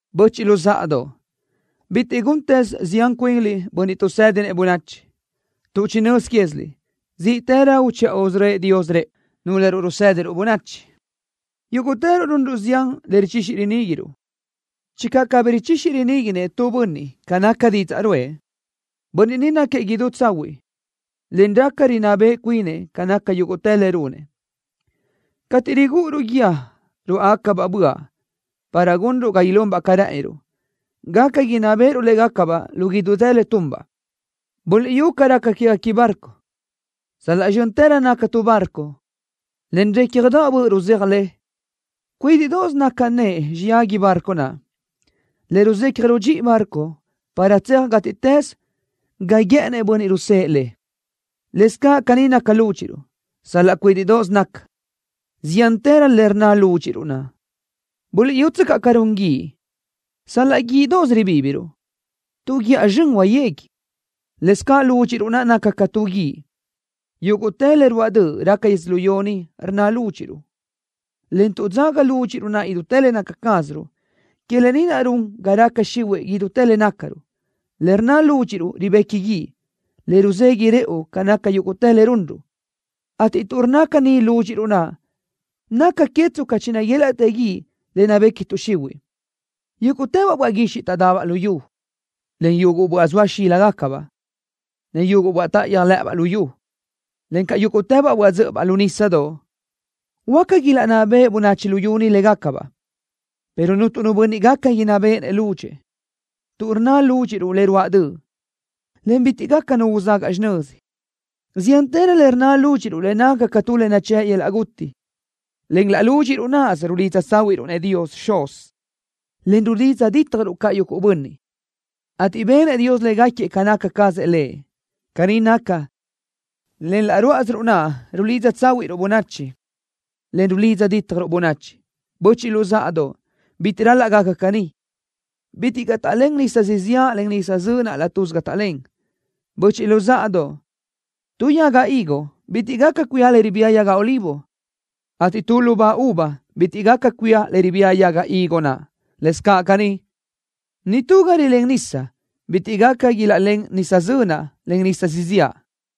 Böchiʼ luzáʼadoʼ, bitiʼ guntëz zián cuinliʼ bönniʼ tuʼsédinëʼ bönachi, tuʼ chinö́z quéziliʼ zíʼtërö uchiʼa usörö́ëʼ Dios rëʼu, núlöruʼ rusédiruʼ bönachi. Yúguʼtëruʼ runruʼ zián le richixi riníguiruʼ. Channö cabí richixi riníguinëʼ tu bönniʼ ca naca didzaʼ ruʼë, bönniʼ ni náquiëʼ idú tsahuiʼ, en raca inná beʼe cuinëʼ ca naca yúguʼtë le runëʼ. Cateʼ rigúʼuruʼ guíë ruáʼagacabaʼ böaʼ para gunruʼ ga ilunbaʼ ca rë́ʼëniruʼ, gaca inná béʼeruʼ légacabaʼ lu idútë le tunbaʼ. Buliʼyú caʼ ca raca quéguequi barco. Sal-laʼ zxö́ntërö naca tu barco, en récjadaʼ böʼ ruzéaj le, cuídiʼdoʼos naca nëʼe xiyágui barco naʼ le ruzecaj rudxíʼi barco para tseaj gátiʼtës ga guë́ʼënnëʼ bönniʼ rusë́ʼë le. Lëscaʼ caní naca lúdxiʼruʼ. Sal-laʼ cuídiʼdoʼos naca, ziántërö le rnna lúdxiʼruʼ naʼ. Buliʼyútsöcaʼ ca run guíʼ. Sal-laʼ guíʼdoʼos ribíbiruʼ, tu guíʼa sibi huayégui. Lëscaʼ lúdxiʼruʼ naʼ naca ca tu guíʼ. Yúguʼtë le ruáʼ döʼ raca yödzölió ni rnna lúdxiʼruʼ, en tuʼ dzaga lúdxiʼruʼ naʼ idútë le naca cázaruʼ, que lë ni naʼ run ga raca xihuiʼ idútë le nácaruʼ. Le rnna lúdxiʼruʼ ribequi guíʼ, le ruzeguiʼ rëʼu ca naca yúguʼtë le runruʼ, ateʼ tuʼ rnna caní lúdxiʼruʼ naʼ, naca que tsca chinaguélaʼtë guíʼ le nabequiʼ tuʼ xihuiʼ. Yúguʼtëbaʼ böaʼ guixiʼ taʼdabaʼ luyú, en yuguʼ böaʼ zoa xíligacabaʼ, en yuguʼ böaʼ táʼayöj lë́ʼëbaʼ lu yu, encaʼ yúguʼtëbaʼ böaʼ dzö́ʼöbaʼ lu nísadoʼ, huáca ilaʼnná beʼe bönachi luyú ni légacabaʼ, pero cuntu nu bönniʼ gaca inná béʼenëʼ lúdxëʼë, tuʼ rnna lúdxiʼruʼ le ruáʼ döʼ, en bitiʼ gaca nu uzagaʼ xinözi. Ziántërö le rnna lúdxiʼruʼ le naca ca tu le nachë́ʼ yöl-laʼ guti. Len laʼ lúdxiʼruʼ náʼasö rulidza tsáhuiʼruʼ-nëʼ Dios Xuz, en rulidza dítjaruʼ caʼ yuguʼ bönniʼ, ateʼ benëʼ Dios légaquiëʼ ca naca cazëʼ Lëʼ. Caní naca, len laʼ ruáʼasiruʼ naʼ rulidza tsáhuiʼruʼ bönachi, en rulidza dítjaruʼ bönachi. Böchiʼ luzáʼadoʼ, bitiʼ ral-laʼ gaca caní. Bitiʼ caʼ taʼlén nisa siziáʼ, en nisa zönaʼ laʼ tuzi ga taʼlén. Böchiʼ luzáʼadoʼ, tu yaga higo bitiʼ gaca cuía le ribía yaga olivo, ateʼ tu lubá uva bitiʼ gaca cuía le ribía yaga higo naʼ. Lëscaʼ caní, nitú ga rilén nisa bitiʼ gaca ilaʼlén nisa zönaʼ, en nisa siziáʼ.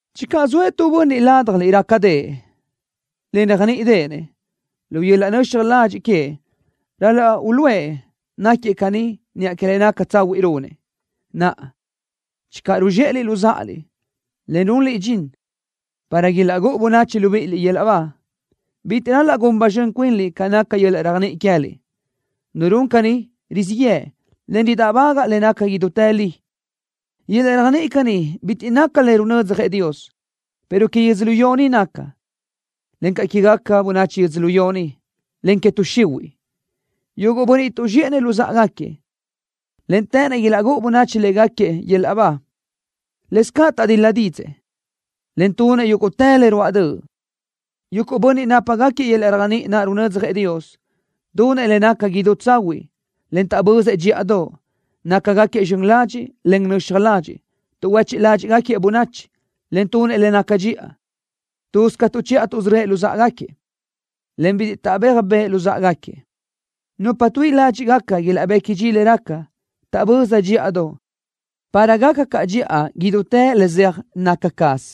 Channö zoëʼ tu bönniʼ ládjaliʼ rácadëʼë, en réajniʼdeʼenëʼ, lu yöl-laʼ nöxaj ladxiʼ queëʼ ral-laʼ uluʼë náquiëʼ caní niʼa que le naca tsahuiʼ runëʼ. Naʼa, channö ruzxéʼeliʼ luzáʼaliʼ, en runliʼ dxin para ilaʼgúʼu bönachi libíʼiliʼ yöl-laʼ ba, bitiʼ ral-laʼ gun ba zxön cuinliʼ ca naca yöl-laʼ réajniʼi queë́liʼ. Nu run caní rizíʼ yëʼ, en ridáʼbagaʼ le naca idútë li. Yöl-laʼ réajniʼi caní bitiʼ naca le runödzjëʼ Dios, pero que yödzölió ni naca, encaʼ quégaca bönachi yödzölió ni, en que tuʼ xihuiʼ. Yuguʼ bönniʼ tuʼzxéʼenëʼ luzáʼagaquiëʼ, en të́ʼënnëʼ ilaʼgúʼu bönachi légaquiëʼ yöl-laʼ ba, lëscaʼ taʼdil-la dídzëʼë, en tunëʼ yúguʼtë le ruáʼ döʼ. Yuguʼ bönniʼ nápagaquiëʼ yöl-laʼ réajniʼi naʼ runödzjëʼ Dios: Tunëʼ le naca idú tsahuiʼ, en taʼbözëʼ dxíʼadoʼ. Nácagaquiëʼ zxön ladxiʼ, en nöxaj ladxiʼ. Tuʼhuechiʼ ládxiʼgaquiëʼ bönachi, en tunëʼ le naca dxiʼa. Tuz ca tuʼchiʼa tuʼsörö́ëʼ luzáʼagaquiëʼ, en bitiʼ taʼbéaj bëʼë luzáʼagaquiëʼ. Nupa tuíʼi ládxiʼgaca ilaʼbequi dxi le raca, taʼböza dxíʼadoʼ, para gaca caʼ dxiʼa idútë le zeaj naca caz.